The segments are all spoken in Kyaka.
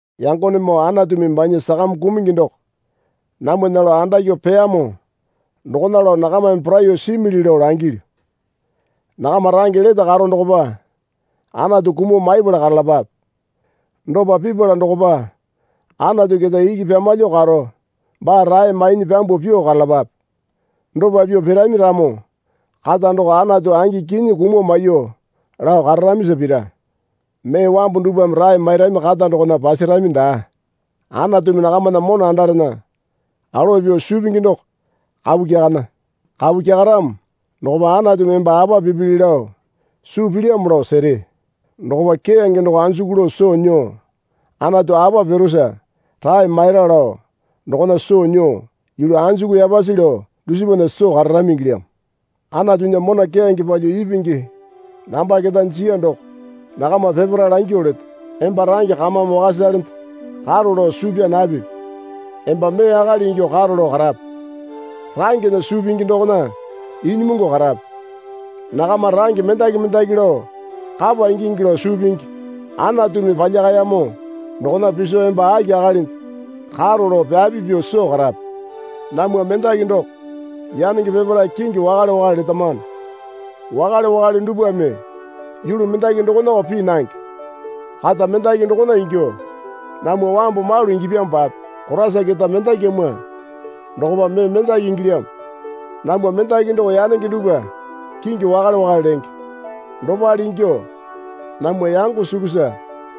Yangonemoo Anatumi banya sakame kumungi doko namwana lao andakyuo peyamo dokona lao nakamame poraiyuo simili lao langilyu. Nakama range lete karo dokopa Anatu kumuo maipala karalapape. Dopa pipala dokopa Anatu keta iki pyamalyuo karo baa rae mainyi pyambuo pyuo karalapape. Dopa pyuo pirami ramo kata doko Anatu angi kinyi kumuo maiyuo lao kararamisa pira. Mee wambu dupwame rae mairami kata dokona pasarami daa. Anatumi nakamana mona andarena alowa pyuo suu pingi doko kapu kyakana. Kapu kyakaramo dokopa Anatumi emba apa pipili lao suu pilyamo lao sere. Dokopa keyange doko anjuku lao soo nyuo Anatu apa pirusa rae maira lao dokona soo nyuo yulu anjuku yapasi lao dusipana soo kararami ingilyamo. Anatunya mona keyange palyuo ipingi namba keta jiya doko nakama peparae langyuo leto. Emba range kamame wakasalende karo lao suu pyaa napipi. Emba mee akali ingyuo karo lao karape. Rangena suu pingi dokona inyimungu karape. Nakama range mendaki mendaki lao kapa ingingi lao suu pingi Anatumi palyakayamo dokona piso emba aki akalinde karo lao pyapi pyuo soo karape. Namwa mendaki doko yanenge peparae kingi wakale wakale letamano. Wakale wakale dupwame yulu mendaki dokonako pii nange. Kata mendaki dokona ingyuo namwa wambu malu ingipyamopape Koraisa keta mendakyamwa dokopa mee mendaki ingilyamo. Namwa mendaki doko yanenge dupwa kingi wakale wakale lenge. Dopale ingyuo namwa yango suksa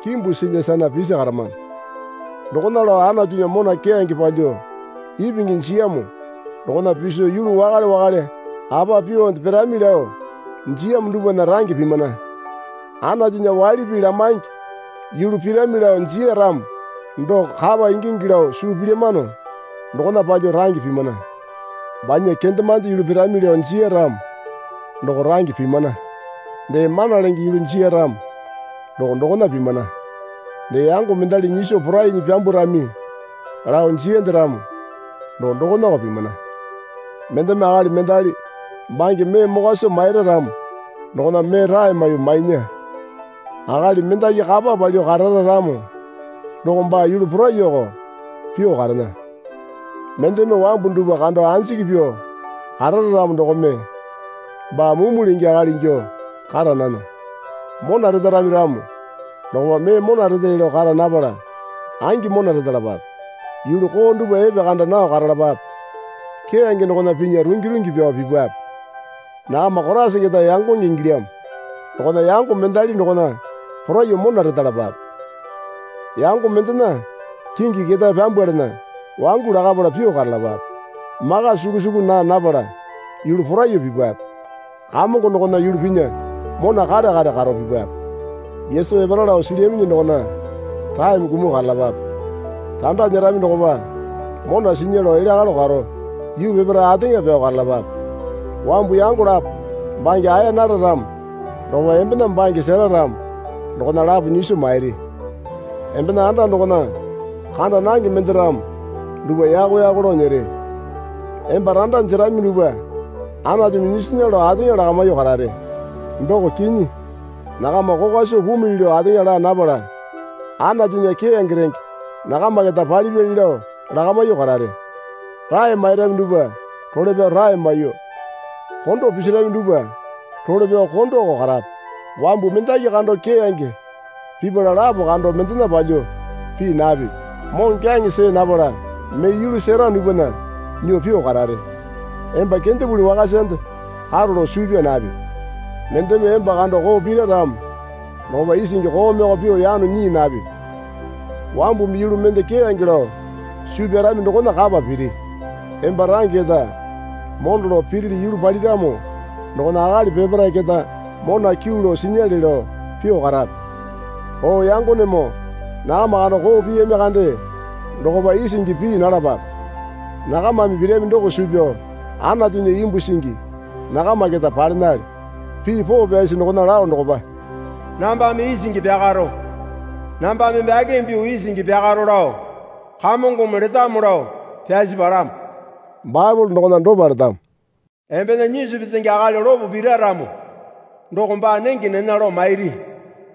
kimbu silya sana pisi karamano. Dokona lao Anatunya mona keyange palyuo ipingi jiyamo dokona piso yulu wakale wakale apa pyuonde pirami lao jiyamo dupwana range pimana. Anatunya waili pii lamaingi yulu pirami lao jiya ramo doko kapa ingingi lao suu pilyamano dokona palyuo range pimana. Banya kendemande yulu pirami lao jiya ramo doko range pimana. Dee mana lenge yulu jiya ramo doko dokona pimana. Dee yango mendali nyiso porainyi pyambwarami lao jiyande ramo doko dokonako pimana. Mendeme akali mendali bange mee mokwa soo maira ramo dokona mee rae maiyuo mainya. Akali mendaki kapa palyuo karara ramo doko baa yulu poraiyuoko pyuo karena. Mendeme wambu dupwa kando anjiki pyuo karara ramo dokome baa mumu lenge akali ingyuo kara nana. Mona retarami ramo dokopa mee mona retele lao kara napala angi mona retalapape. Yulu koo dupwa epekanda nao karalapape. Keyange dokona pinya rungi rungi pyao pipape. Nakama Koraisa keta yangonge ingilyamo dokona yango mendali dokona poraiyuo mona retalapape. Yango mendena kingi ketae pyambwalana wangu lakapala pyuo karalapape. Maka suku suku naa napala yulu poraiyuo pipape. Kamongo dokona yulu pinya mona kare kare karo pipape. Yesu epara lao silyaminyi dokona raeme kumuo karalapape. Randa nyerami dokopa mona sinya lao elya kalo karo yuu peparae ateŋa pyao karalapape. Wambu yango lapo bange aeya nara ramo dokopa embena bange sera ramo dokona lapo nyiso mairi. Embena anda dokona kanda nange mende ramo dupwa yako yako lao nyere. Emba randa jerami dupwa Anatumi nyisinya lao ateŋa lakamyuo karare. Doko kinyi, nakama kokwa soo pumili lao ateŋa laa napala Anatunya keyange renge nakama keta palipyali lao lakamyuo karare. Rae mairami dupwa role pyao rae maiyuo, kondo pisirami dupwa role pyao kondoko karape. Wambu mendaki kando keyange pipala lapo kando mendena palyuo pii napipi. Moŋokyaŋe see napala mee yulu sera dupwana nyuo pyuo karare. Emba kendepuli wakasande karo lao suu pyaa napipi. Mendeme emba kando koo pira ramo dokopa isingi koomeko pyuo yano nyii napipi. Wambumi yulu mende keyange lao suu pyarami dokona kapa piri. Emba range keta mondo lao pirili yulu paliramo dokona akali peparae keta mona kyuu lao sinyale lao pyuo karape. O yangonemoo nakama kando koo piyami kande dokopa isingi pii nalapape. Nakamame pirami doko suu pyao Anatunya imbu singi nakama keta palenale. Pii poo pyasi dokona lao dokopa, Nambame isingi pyakaro, nambame bakeme pyuo isingi pyakaro lao Kamongome letamo lao pyasi palamo. Baepole dokona dopa letamo. Embena nyisu petenge akali lopo pira ramo doko baa nenge nena lao mairi.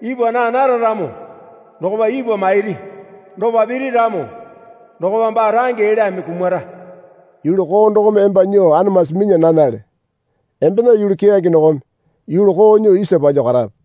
Ipwa naa nara ramo dokopa ipwa mairi. Dopa piri ramo dokopa baa range elyame kumara. Yulu koo dokome emba nyuo anamasi minya nanale. Embena yulu keyange dokome yulu koo nyuo isa palyuo karape.